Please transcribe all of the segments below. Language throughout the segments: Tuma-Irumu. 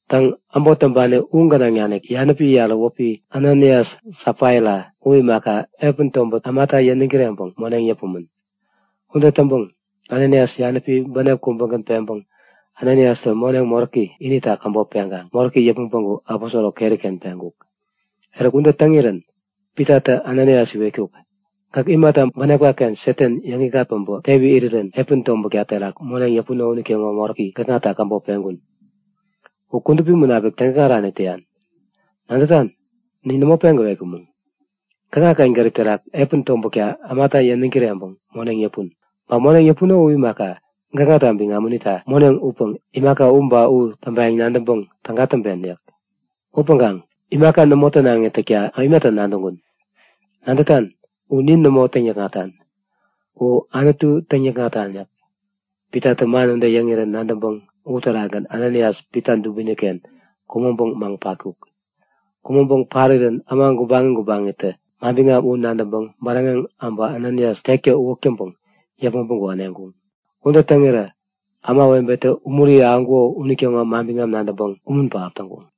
Täŋ, äbot täŋpani u gänaŋ nanik yanäpi yarä wäpi Ananias Safaira u imaka, epän tobäri ämata yäniŋ kireŋpäŋ moneŋ yäpumän. Ude täŋpäŋ Ananias yanäpi bänep kubägän peŋpäŋ Ananiastä moneŋ moräki inita käbop peŋkaŋ moräki yäpmäŋ päŋku aposoro keri-ken peŋkuk. Eruk ude täŋirän Pitatä Ananias iwetkuk; Gäk imata bänepka-ken Satan yäŋikŋat päbä tewi irirän epän tobätka terak moneŋ yäpuno unitäŋo moräki gäkŋata käbop peŋkun? U Kudupi Munapik täŋikŋarani täyan! Nadätan? Nin nämo peŋ gäwetkumäŋ. Gäkŋaken gärip terak epän tobätka ämata yäniŋ kireŋpäŋ moneŋ yäpun. Ba moneŋ yäpuno u imaka, gäkŋata biŋam unita moneŋ upäŋ imaka u ba u täŋpayäŋ nadäŋpäŋ täga täŋpen yäk. Upäŋkaŋ imaka nämo tänaŋi täkta imata nadäŋkun? Nadätan? U nin nämo täŋ-nikŋatan, u Anutu täŋikŋatan yäk. Pitatä man ude yäŋirän nadäŋpäŋ uterakgän Ananias Pita dubini-ken kumäŋpäŋ maŋ patkuk. Kumäŋpäŋ parirän äma gubaŋi gubaŋitä manbiŋam u nadäŋpäŋ bäräŋeŋ äbä Ananias tektä uwäk täŋpäŋ yäpmäŋ päŋku äneŋkuŋ. Ude täŋirä ämawebetä umuri ahäŋkuko unitäŋo manbiŋam nadäŋpäŋ umun pähap täŋkuŋ.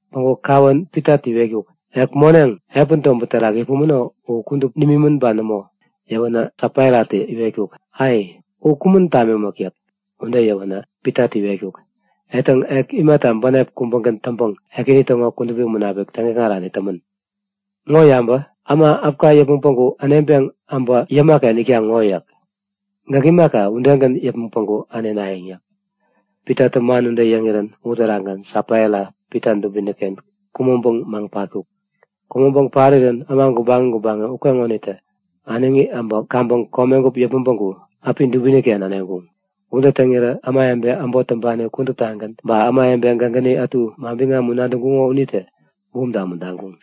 Päŋku kawän Pitatä iwetkuk; Ek moneŋ, epän tobät terak yäpumäno u kudup nimimän ba nämo? Yäwänä Safairatä iwetkuk; Ei, u kumän tamimäk yäk. Ude yäwänä Pitatä iwetkuk; Etäŋ, ek imata bänep kubägän täŋpäŋ Ekäni täŋo Kudupi Munapik täŋikŋarani tämän? Ŋo yabä! Äma äpka yäpmäŋ päŋku äneŋpeŋ äbä yäma-ken itkaŋ ŋo yäk. Gäk imaka, udegän yäpmäŋ päŋku änenayäŋ yäk. Pitatä man ude yäŋirän uterakgän Safaira Pita dubini-ken kumäŋpäŋ maŋ patkuk. Kumäŋpäŋ parirän äma gubaŋi gubaŋi ukeŋonitä äneŋi äbä kaŋpäŋ komegup yäpmäŋ päŋku äpi dubini-ken äneŋkuŋ. Ude täŋirä ämawebe äbot täŋpani kuduptagän ba ämawebe gägäni ätu manbiŋam u nadäŋkuŋo unitä bumta umuntaŋkuŋ.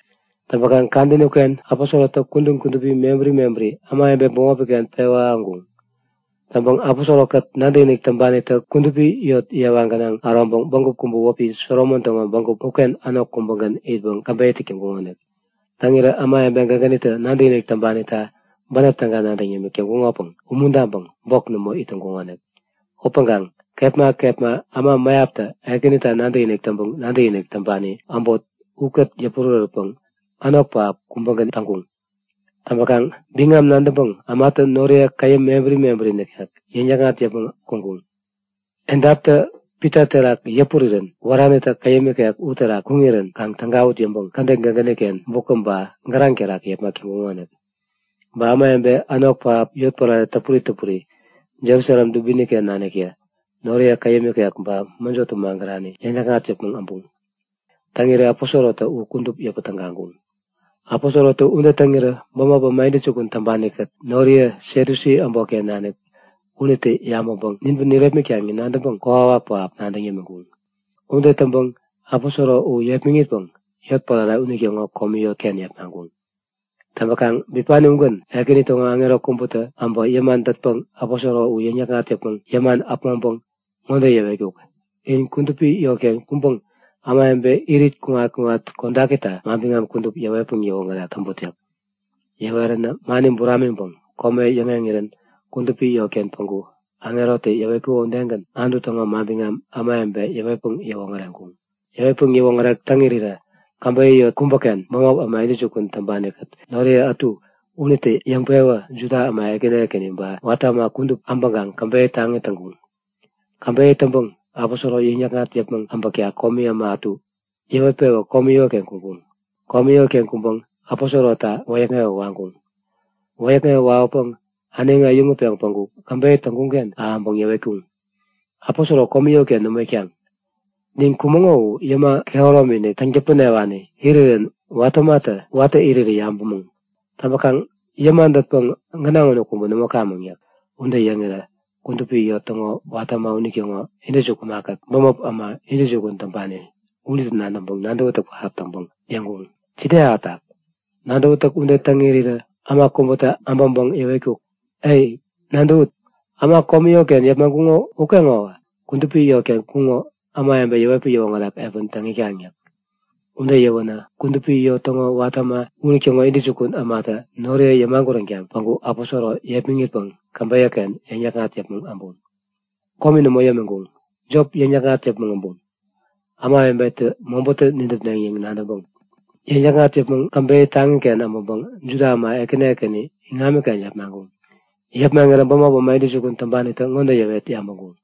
Täŋpäkaŋ kadäni uken aposorotä kudän kudupi mebäri mebäri ämawebe bämopi-ken pewä ahäŋkuŋ. Täŋpäŋ aposoro-kät nadäkinik täŋpanitä kudupi yot yewa gänaŋ äroŋpäŋ bägup kubä wäpi Solomon täŋo bägup uken änok kubägän itpäŋ käbeyä täk täŋkuŋonik. Täŋirä ämawebe gägänitä nadäkinik täŋpanita bänep täga nadäŋ yämik täŋkuŋopäŋ umuntaŋpäŋ bok nämo it täŋkuŋonik. Upäŋkaŋ kepma kepma äma mäyaptä Ekänita nadäkinik täŋpäŋ nadäkinik täŋpani äbot ukät yäpurärätpäŋ änok pähap kubägän täŋkuŋ. Täŋpäkaŋ biŋam nadäŋpäŋ ämatä noriye käyäm mebäri mebäri nikek yäŋ-yäkŋat yäpmäŋ kuŋkuŋ. Edaptä Pita terak yäpurirän wäranitä käyäm ikek uterak kuŋirän kaŋ tägawut yäŋpäŋ kädet gägäni-ken bukä ba gäraŋ terak yepmak täŋkuŋonik. Ba ämawebe änok pähap yotpärare täpuri täpuri Jerusalem dubini-ken naniktä noriye käyäm ikek ba mäjotä magärani yäŋ-yäkŋat yäpmäŋ äbuŋ. Täŋirä aposorotä u kudup yäpä tägaŋkuŋ. Aposorotä ude täŋirä bämop äma intäjukun täŋpani-kät noriye Satyusi äbotken nanik unitä yabäŋpäŋ ninpäŋ nirepmitkaŋ yäŋ nadäŋpäŋ kokwawak pähap nadäŋ yämiŋkuŋ. Ude täŋpäŋ aposoro u yepmäŋitpäŋ yotpärare unitäŋo komi yotken yepmaŋkuŋ. Täŋpäkaŋ bipani ugän Ekäni täŋo aŋero kubätä äbä yäma dätpäŋ aposoro u yäŋ-yäkŋat yäpmäŋ yäman äpmoŋpäŋ ŋode yäwetkuk; In kudupi yotken kuŋpäŋ ämawebe irit kuŋat-kuŋat kodakita manbiŋam kudup yäwetpäŋ yäwoŋärek täŋput yäk. Yäweränä mani buramiŋpäŋ kome yäŋeŋirän kudupi yotken päŋku aŋerotä yäwetkuko udegän Anutu täŋo manbiŋam ämawebe yäwetpäŋ yäwoŋäreŋkuŋ. Yäwetpäŋ yäwoŋärek täŋ irirä käbeyä yot kubäken bämop äma intäjukun täŋpani-kät noriye ätu unitä yäŋpewä Juda äma ekäni ekäni ba watä äma kudup äbäkaŋ käbeyä taŋi täŋkuŋ. Käbeyä täŋpäŋ aposoro yäŋ-yäkŋat yäpmäŋ äbäkta komi äma ätu yäwet-pewä komi yotken kuŋkuŋ. Komi yotken kuŋpäŋ aposorota wäyäkŋewä waŋkuŋ. Wäyäkŋewä wawäpäŋ äneŋi äyäŋutpeŋ päŋku käbeyä täŋkuŋ-ken ahäŋpäŋ yäwetkuŋ; Aposoro komi yotken nämo itkaŋ! Nin kumäŋo u yäma kehäromi-inik täŋ-täpänewani irirän watä ämatä watä irirä yabämäŋ. Täŋpäkaŋ yäma dätpäŋ gänaŋ unu kubä nämo kamäŋ yäk. Ude yäŋirä kudupi yot täŋo watä äma unitäŋo intäjukun ämakät bämop äma intäjukun täŋpani unitä nadäŋpäŋ nadäwätäk pähap täŋpäŋ yäŋkuŋ; Jide ahätak? Nadäwätäk ude täŋ irirä äma kubätä äbäŋpäŋ yäwetkuk; Ai, nadäwut! Äma komi yotken yepmaŋkuŋo ukeŋowä kudupi yotken kuŋo ämawebe yäwetpäŋ yäwoŋärek epän täŋ itkaŋ yäk. Ude yäwänä kudupi yot täŋo watä äma unitäŋo intäjukun ämatä noriye yämaguränkaŋ päŋku aposoro yepmäŋitpäŋ käbeyä-ken yäŋ-yäkŋat yäpmäŋ äbuŋ. Komi nämo yämiŋkuŋ. Jop yäŋ-yäkŋat yäpmäŋ äbuŋ, ämawebetä mobätä nidäpneŋ yäŋ nadäŋpäŋ. Yäŋ-yäkŋat yäpmäŋ käbeyä taŋiken äbäŋpäŋ Juda äma ekäni ekäni iŋamiken yepmaŋkuŋ. Yepmaŋirä bämop äma intäjukun täŋpanitä ŋode yäwet yabäŋkuŋ;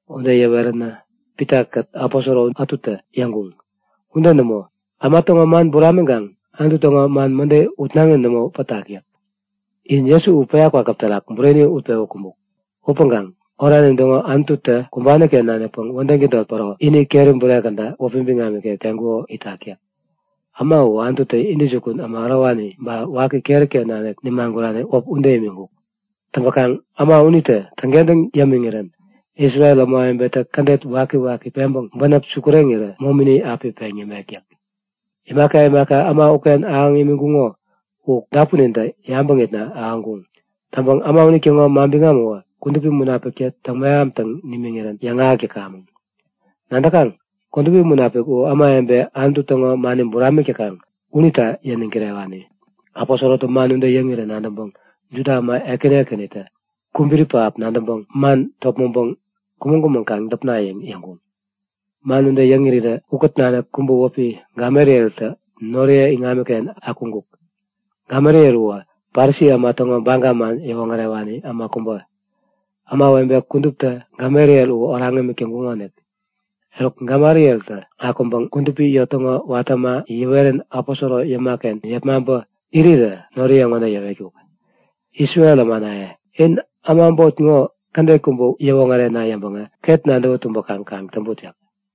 Ude yäweränä Pitakät aposoro ätutä yäŋkuŋ; Ude nämo! Äma täŋo man buramiŋkaŋ Anutu täŋo man mäde utnaŋi nämo pätak yäk. In Jesu u päya kwakäp terak bureni utpewä kumbuk. Upäŋkaŋ oranin täŋo Anututä kumbani-ken nanikpäŋ wädäŋ tädot päro ini keri bure käda wäpi biŋam ikek teŋkuko itak yäk. Äma u Anututä intäjukun äma ärowani ba waki keri-ken nanik nimagurani wäp ude imiŋkuk. Täŋpäkaŋ äma unitä täŋkentäŋ yämiŋirän Isrel ämawebetä kädet wakiwaki peŋpäŋ bänep sukureŋirä momini api peŋ yämek yäk. Imaka imaka äma uken ahäŋ imiŋkuŋo u dapunintä yabäŋitna ahäŋkuŋ. Täŋpäŋ äma unitäŋo manbiŋam uwä Kudupi Munapiktä täŋ-mehamtaŋ nimiŋirän yäŋahäk täkamäŋ. Nadäkaŋ, Kudupi Munapik u ämawebe Anutu täŋo mani buramik täkaŋ unita yäniŋ kirewani. Aposorotä man ude yäŋirä nadäŋpäŋ Juda äma ekäni ekänitä kubiri pähap nadäŋpäŋ man topmäŋpäŋ kumäŋ-kumäŋ kaŋ däpna yäŋ yäŋkuŋ. Man ude yäŋ irirä ukät nanik kubä wäpi Gamalieltä noriye iŋamiken akuŋkuk. Gamaliel uwä Parisi äma täŋo Baga man yäwoŋärewani äma kubä. Ämawebe kuduptä Gamaliel u oraŋ imik täŋkuŋonik. Eruk, Gamalieltä akuŋpäŋ kudupi yot täŋo watä äma yäwerän aposoro yäma-ken yepmaŋpä irirä noriye ŋode yäwetkuk; Isrel ämanaye, in äma äbot ŋo kädet kubä yäwoŋärena yäŋpäŋä ket nadäwä tumbäkaŋ kaŋ täŋput yäk.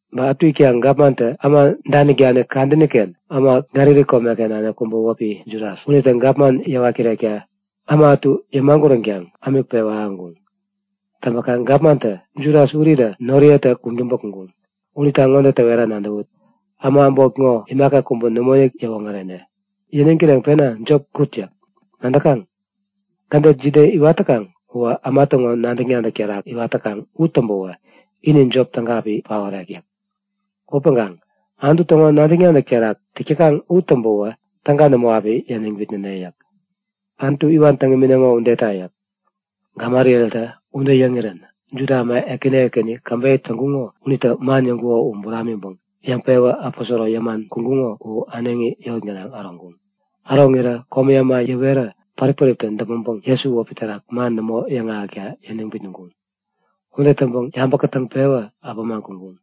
Ba ätu itkaŋ gapmantä äma danik-danik kadäni-ken äma Galili komeken nanik kubä wäpi Judas, unitä gapman yäwat kirekta äma ätu yämaguränkaŋ ämik pewä ahäŋkuŋ. Täŋpäkaŋ gapmantä Judas urirä noriyetä kuŋtäŋpä kuŋkuŋ. Unita ŋode täwera nadäwut; Äma äbot ŋo imaka kubä nämoinik yäwoŋärene. Yäniŋ kireŋpena jop kut yäk. Nadäkaŋ? Kädet jide iwat täkaŋ uwä äma täŋo nadäk-nadäk terak iwat täkaŋ u täŋpäwä ini jop täga api paorek yäk. Upäŋkaŋ Anutu täŋo nadäk-nadäk terak täk täkaŋ u täŋpäwä täga nämo api yäniŋ bitnäneŋ yäk. Anutu iwan täŋ imineŋo udeta! yäk. Gamalieltä ude yäŋirän Juda äma ekäni ekäni käbeyä täŋkuŋo unitä man yäŋkuko u buramiŋpäŋ yäŋpewä aposoro yäman kuŋkuŋo u äneŋi yot gänaŋ äroŋkuŋ. Äroŋirä komi äma yäwerä pärip-päriptä däpmäŋpäŋ Jesu wäpi terak man nämo yäŋahäkta yäniŋ bitnäŋkuŋ. Ude täŋpäŋ yabä kätäŋpewä äpämaŋ kuŋkuŋ.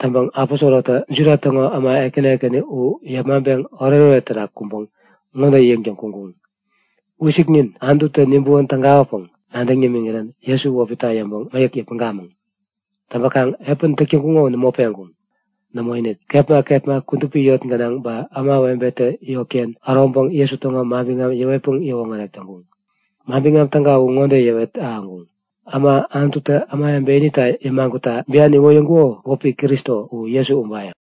Täŋpäŋ aposorotä Juda täŋo äma ekäni ekäni u yepmaŋpeŋ oretoret terak kuŋpäŋ ŋode yäŋtäŋ kuŋkuŋ; Wisiknin, Anututä nibäwän tägawäpäŋ nadäŋ nimiŋirän Jesu wäpita yäŋpäŋ mäyäk yäpmäŋkamäŋ! Täŋpäkaŋ epän täk täŋkuŋo u nämo peŋkuŋ. Nämoinik, kepma kepma kudupi yot gänaŋ ba ämawebetä yotken äroŋpäŋ Jesu täŋo manbiŋam yäwetpäŋ yäwoŋärek täŋkuŋ. Manbiŋam Täga u ŋode yäwet ahäŋkuŋ; Äma Anututä ämawebe inita yämagutta bian iwoyäŋkuko wäpi Kristo u Jesu ubayäŋ!